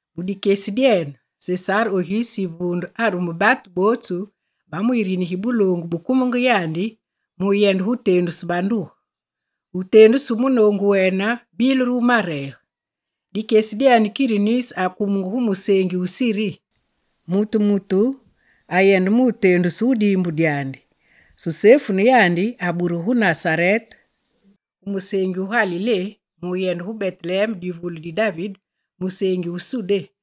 Mu dikyesi dyene, Sesare Oguste yivunde arume batu botsu ba mu yirini gi buloongu bu kumenge yandi mu yende tendusu banduge. Wutendusu wu munongu wene bile re wu marege. Dikyesi dyene Kirinus akumenge gu musengi wu Sudé. Mutu mutu ayende mutendusu gu dimbu dyandi. Susefu ne yandi aburugu gu Nasarete gu musengi wu Galilé mu yende gu Beteleme musengi wu Sudé,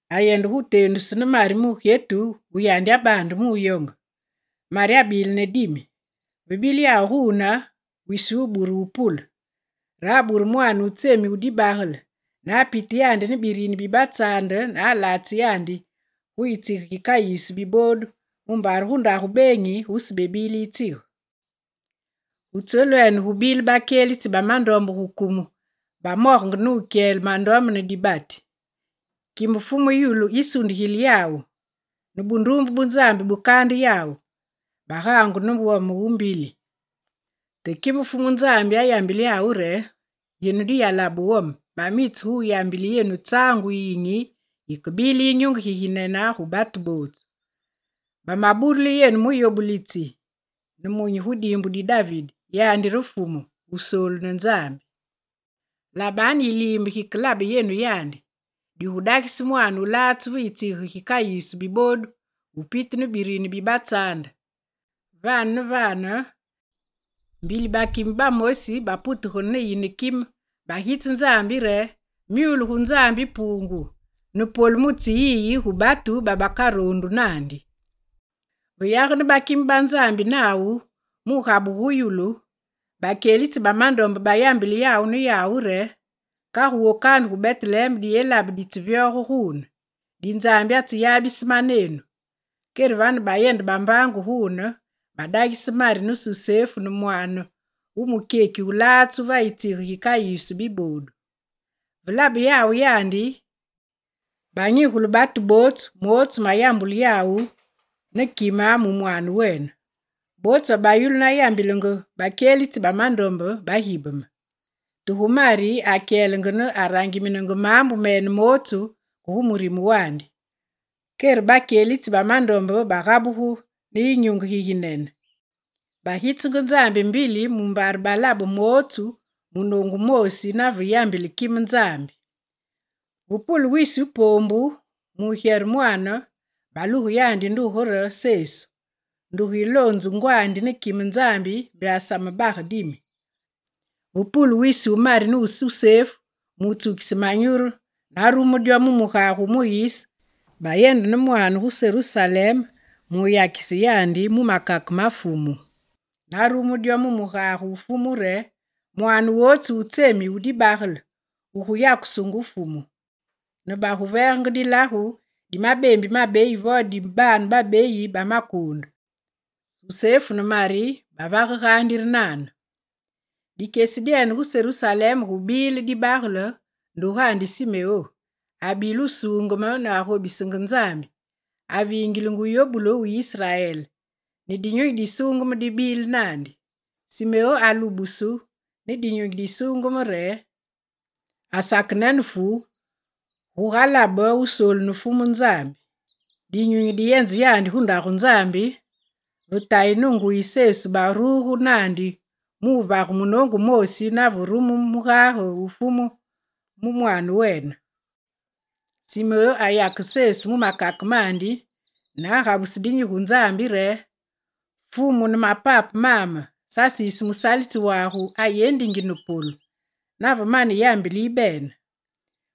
mu yende tendusu ne Mari mugyetu wu yandi abande mu yonge. Mari abile ne dimi. Ve bile yawu gwune, wisi wubure wupule. Re abure mwane wu tsemi wu dibagele, ne apite yandi ne birini bi batsande ne alatse yandi gu yitsige gikayisu bibodu mumbare gu ndagu benyi gusebile yitsige. Gu tselwene gubile bakyelitsi ba mandombe gu kumu bamogenge ne wukyele mandombe ne dibati. Kime Fumu Nzambi yisundigile yawu, ne bundumbe bu Nzambi bukande yawu. Bagangu ne wome wu mbili. Te kime Fumu Nzambi ayambile yawu re: «Yenu diyalabe wome, mamitse gu yambile yenu tsangu yiyinyi yikebile yinyunge giginene gu batu botsu. Bamaburile yenu muyobulitsi nemunyi gu dimbu di David, yandi re Fumu, Wusoolu ne Nzambi. Labanu yilimbe gikeyabe yenu yandi: Digudagise mwane wulatsu va yitsige gikayisu bibodu wupitu ne birini bi batsande.» Vane ne vane mbili bakime bamosi ba Nzambi baputegene ne yine kime, bagitse Nzambi re: «Myule gu Nzambi Pungu, ne polu mu tsyeyiyi gu batu babakarondu nandi.» Ve yagene bakime ba Nzambi nawu mu gabuge gu yulu, bakyelitsi ba mandombe, bayambilenge yawu ne yawu re: «Kagu wokanu gu Beteleme diyelabe ditsevyoge gwune, di Nzambi atseyabise manenu.» Kerevane, bayende bambangu gwune, badagise Mari ne Susefu ne mwane wu mukyeki wulatsu va yitsige gi kayisu bibodu. Ve labe yawu yandi, banyigule batu botsu motsu mayambulu yawu ne kime mu mwane wene. Botsu babayulu na yambilenge bakyelitsi ba mandombe, bagibeme. Te gu Mari, akyelenge, ne arangiminenge mambu mene motsu ke gu murime wandi. Kere bakyelitsi ba mandombe bagabugu ne yinyunge giginene, bagitsenge Nzambi mbili mumbare balabe motsu munongu wumoosi nave yambile kime Nzambi. Ve pule wisi wu pombu mugyere mwane, baluge yandi nduge re Sesu, nduge yilonzu ngwandi ne kime Nzambi mbe asamebage dimi. Ve pule wisi wu Mari ne Susefu mu tsukise manyuru narumu dyo mu mugage wu Muyise, bayende ne mwane gu Serusaleme muyakise yandi mu makake ma Fumu. Na rumu dyo mu mugage wu Fumu re: «Mwane wotsu wu tsemi wu dibagele wugu yakusungu Fumu.» Ne bagu vegenge dilagu di mabembi mabeyi, vo dibane babeyi ba makunde, Susefu ne Mari bavage gandi re nane. Dikyesi dyena, gu Serusaleme, gubile dibagele ndugandi Simeo. Abile wusungeme, ne agobisenge Nzambi, avingilenge wuyobulu wu Israel, ne Dinyunyi di Sungeme dibile nandi. Simeo alubusu ne Dinyunyi di Sungeme re: «Asakenene fu gugalabe Kristi wusoolu ne Fumu Nzambi.» Dinyunyi diyenze yandi gu ndagu Nzambi, ve tayi ne nguyi Sesu baruge nandi muvage munongu wumoosi nave rume mugage wu Fumu mu mwane wene. Simeo ayake Sesu mu makake mandi, ne agabuse dinyi gu Nzambi re: «Fumu, ne mapape mame, sasisi musalitsi wagu ayendingi ne polu, nave mane yambile yibene.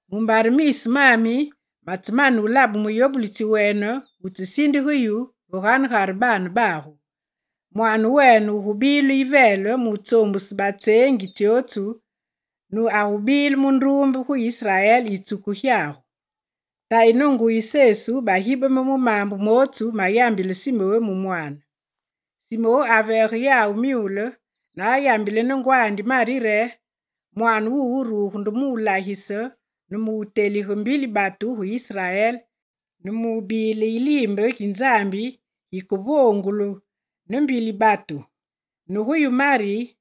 Mumbare misu mami matsemane labe muyobulitsi wene, wutsesindige yu va ganegare baane bagu. Mwane wene wugubile yivele mu tsombuse batsengi tsyotsu, ne agubile mundumbe gu Israel yitsuku gyagu.» Tayi ne nguyi Sesu bagibeme mu mambu motsu mayambile Simeo mu mwane. Simeo avege yawu myule ne ayambile ne ngwandi Mari re: «Mwane wuwu wuruge mulagise, ne mutelige mbili batu gu Israel, ne mubile yilimbe gi Nzambi gikevongulu ne mbili batu. Ne yu Mari,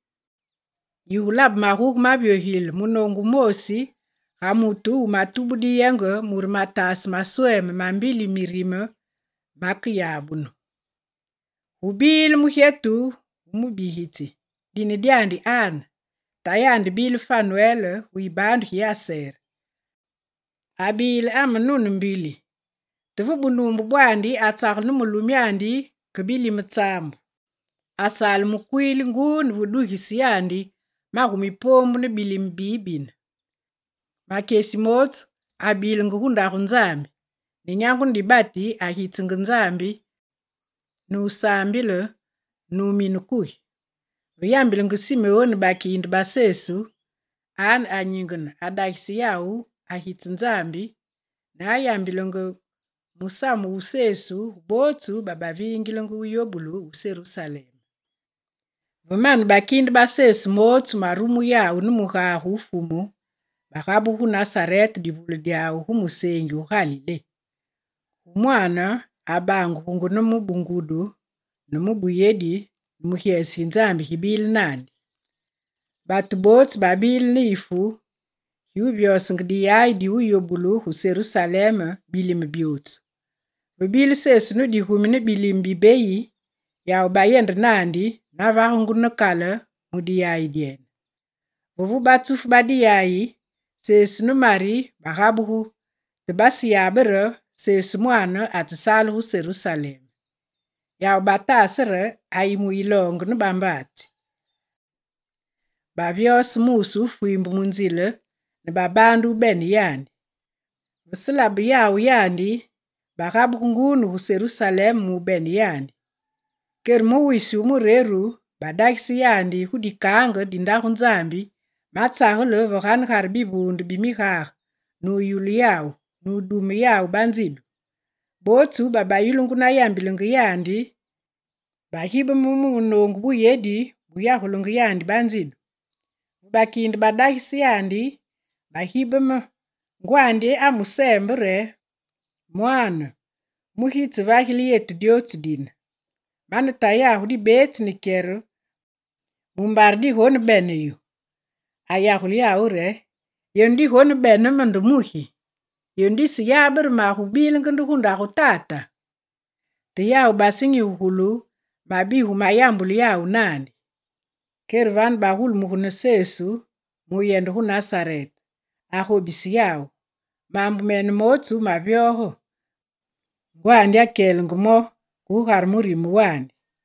yigulabe maguge mavyogilile munongu wumoosi ga mutu wumatubu diyenge mure matase masweme ma mbili mirime, makeyabunu.» Gubile ne mugyetu wu mubigitsi, dine dyandi Ane. Tayandi bile Fanwele gu yibandu gi Aser. Abile amenune mbili, te ve bunumbe bwandi atsagele ne mulumyandi ke bilime tsambu. Asale mukwili ngwu ne ve dugise yandi magumi pombu ne bilime bibine. Makyesi motsu, abilenge gu ndagu Nzambi; ne nyangu ne dibati, agitsenge Nzambi, nusambile, numina kugi. Ve yambilenge Simeo ne bakinde ba Sesu, Ane anyingene, adagise yawu, agitse Nzambi, ne ayambilenge musamu wu Sesu gu botsu babavingilenge wu yobulu wu Serusaleme. Ve mane bakinde ba Sesu motsu marumu yawu mu mugage wu Fumu, bagabugu gu Nasarete divule dyawu gu musengi wu Galilé. Gu mwane, abangugunge ne mu bungudu, ne mu buyedi, ne myule mi Nzambi mibile nandi. Batu botsu babile ne yifu giwuvyosenge diyayi di wuyobulu gu Serusaleme bilime byotsu. Ve bile Sesu ne digumi ne bilime bibeyi, yawu bayende nandi na vagungu ne kale mu diyayi dyene. Ve vu batsufu ba diyayi, Susefu ne Mari bagabugu, te baseyabe re Sesu mwane atsesale gu Serusaleme. Yawu batase re Sesu ayi mu yilonge ne bambatsi. Bavyose muse wu fwimbe mu nzile, ne babande wubene yandi. Ve selabe yawu yandi, bagabugu ngwu ne gu Serusaleme mubene yandi. Kere mu wisi wu mureru, badagise yandi gu dikange di ndagu Nzambi, matsagele ve ganegare bivunde bi migage, nu yululu yawu, nu dume yawu banzidu. Botsu babeyulungu na yambilenge yandi bagibeme mu munongu buyedi buyagulenge yandi ba nzidu. Ve bakinde badagise yandi, bagibeme, ngwandi amusembe re: «Mwane, mugi yitsevagile yetu dyotsu dine? Mane tayagu dibetsi ne kyere mumbare digonebene yu.» Ayagule yawu re: «Yenu digonebene me nde mugi? Yenu diseyabe re magubilenge nde gu ndagu Tata?» Te yawu basenyigugulu mabigu mayagulu yawu nandi. Kerevane, bagulumuge ne Sesu mu yende gu Nasarete. Agobisenge yawu. Mambu mene motsu mavyoge, ngwandi akyelenge mo ke gugare murime wandi.